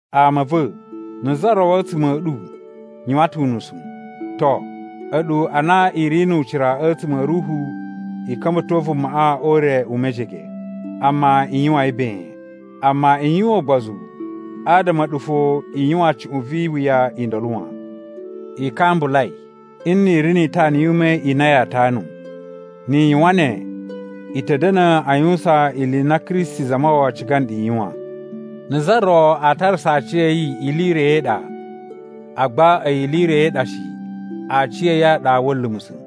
Ama a̱ va̱, na̱ za ro a̱tsuma̱ a̱ ɗu yuwan ta̱ unusu, to, a̱ɗu a na i ri nu ucira a̱tsuma̱ a̱ Ruhu i ka̱mba̱to vumaꞌa o ure u mejege. Amma i yuwan yi ben. Amma i yuwan ugbozu, adama a̱ɗu fo i yuwan cuꞌun vi iwuya i ndolo wan. I kambulai nni i ri ni itana yu ume i na yaa tanu. Ni i yuwan ne, i ta̱ da̱na̱ a yuwusan ili i na Kristi Zamawawa ciga nɗu i yuwan. Na̱ za ro a tarasa aciya̱yi ili i ro i ɗa, agba a̱yi ili i ro i ɗa shi, aciya̱yi a ɗa wa̱a̱ lumusa̱.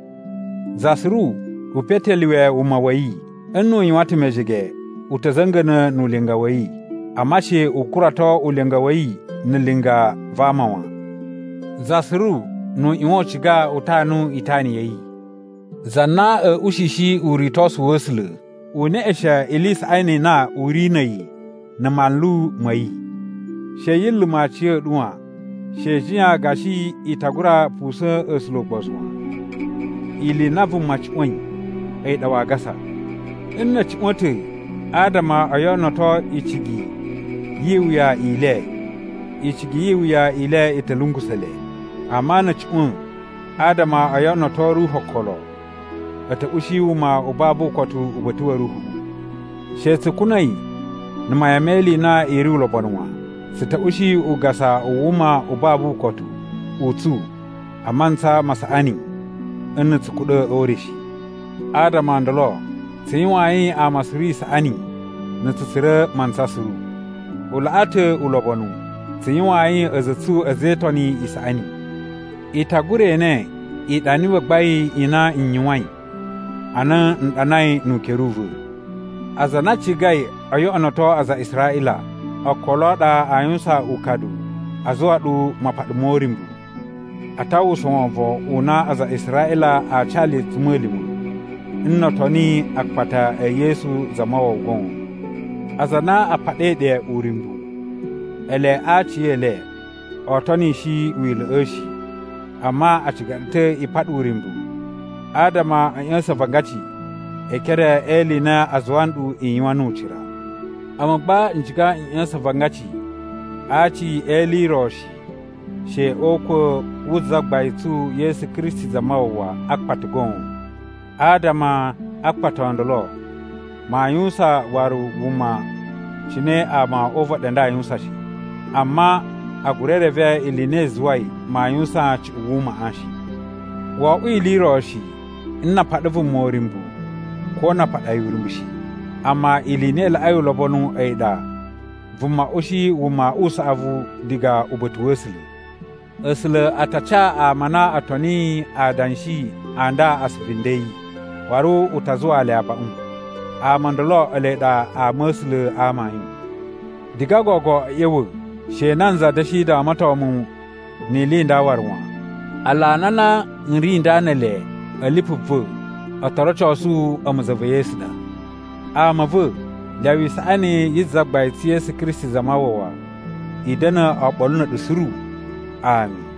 Za suru u petelyuwe wuma wa̱ yi. Nnu u yuwan ta̱ mejege, u ta̱ za̱nga̱na̱ nu ulinga wa̱ yi. Amma she u kurato ulinga wa̱ yi na̱ linga va ama wan. Za suru nu u ꞌyuwan u ciga u tanu itana ya̱ yi. Za na a̱ ushishi uritosu wa̱ A̱sula̱, u neꞌeshen ili i saꞌani i na u ri na̱ a̱yi na̱ manlu ma̱ yi. She yi luma̱ aciya̱ɗu wan: She i jiyan gashi i ta gura pusa̱n A̱sula̱ ugbozu wan. Ili i na vuma cuꞌwa̱in a̱yi ɗa waa gasa. Nna̱ a̱ cuꞌwa̱n ta̱ adama o yoꞌonoto icigi yi iwuya i le, icigi yi iwuya i le i ta̱ lungusa̱ le. Amma na̱ a̱ cuꞌwa̱n adama o yoꞌonoto Ruhu okolo, a̱ ta̱ ushi wuma u babu ukotu uba̱ta̱ wa̱ Ruhuꞌu. She tsu kuna̱i na̱ mayan me ili i na i ri ulobonu wan, tsu ta̱ ushi ugasa u wuma u babu ukotu u tsu a mantsa ma saꞌani nna̱ tsu kuɗa̱ o ure shi. Adama o ndolo tsu yuwayin ama suru isaꞌani na̱ tsu tsura̱ mantsa suru. U laꞌa ta̱ ulobonu tsu yuwayin a̱za̱ a̱ tsu a̱za̱ e Itoni i saꞌani. I ta gura ene iɗani i gbagbain i na n yuwain ana n ɗanai nu ukere u va̱. Aza a na a cigai o yoꞌonoto aza a Israꞌila okolo a ɗa a yuwusan ukadu a zuwa ɗu mapaɗa mo uryumbu. A ta uwwusa wovon u na aza a Israꞌila a ca le a̱tsuma̱lima̱ nno o toni akpata e Yesu Zamawawa goon. Aza a na a paɗai ɗe uryumbu, ele a aciyele oo tonishi Wila̱ꞌa̱ shi, amma a ciga ɗu ta̱ i paɗa uryumbu adama a̱ ꞌya̱sa̱n avangaci e ekere e ili i na a zuwa nɗu i yuwan nu ucira. A̱mu gba, n ciga n ꞌya̱sa̱n avangaci a aci e ili i ro shi, she o ukwa̱ wu Zagbain tsu Yesu Kristi Zamawawa a akpata goon. Adama a akpata o ndolo, maa yuwusan waru wuma cine ama o uvaɗi a nda a yuwusan shi. Amma a gura reve ili i na i zuwai maa yuwusan cuꞌun wumaꞌa shi. Wo oꞌwo ili i ro shi nna a paɗa vuma uryumbu ko na a paɗa yi uryumbu shi. Amma ili i na i laꞌai ulobonu a̱yi ɗa vuma ushi wuma u saꞌavu diga uba̱ta̱ wa̱ A̱sula̱. A̱sula̱ a ta ca ama a na o toniyi adanshi a nda asuvu nden a̱ yi, waru u ta zuwaa le abaꞌun. Ama o ndolo ele ɗa ama a̱ A̱sula̱ a amayun. Diga gogo a̱ ꞌya̱wa̱, she nanza da̱shi damaton mu ni ili i nda waru wan. Alana a na n ri nda ne ele a̱ lipu va̱ o to rocosu a̱mu za va̱ Yesu ɗa. Ama a̱ va̱, lyawa isaꞌani yi Zagbain tsu Yesu Kristi Zamawawa i da̱na̱ oɓolo na̱ a̱ɗu suru. Ami.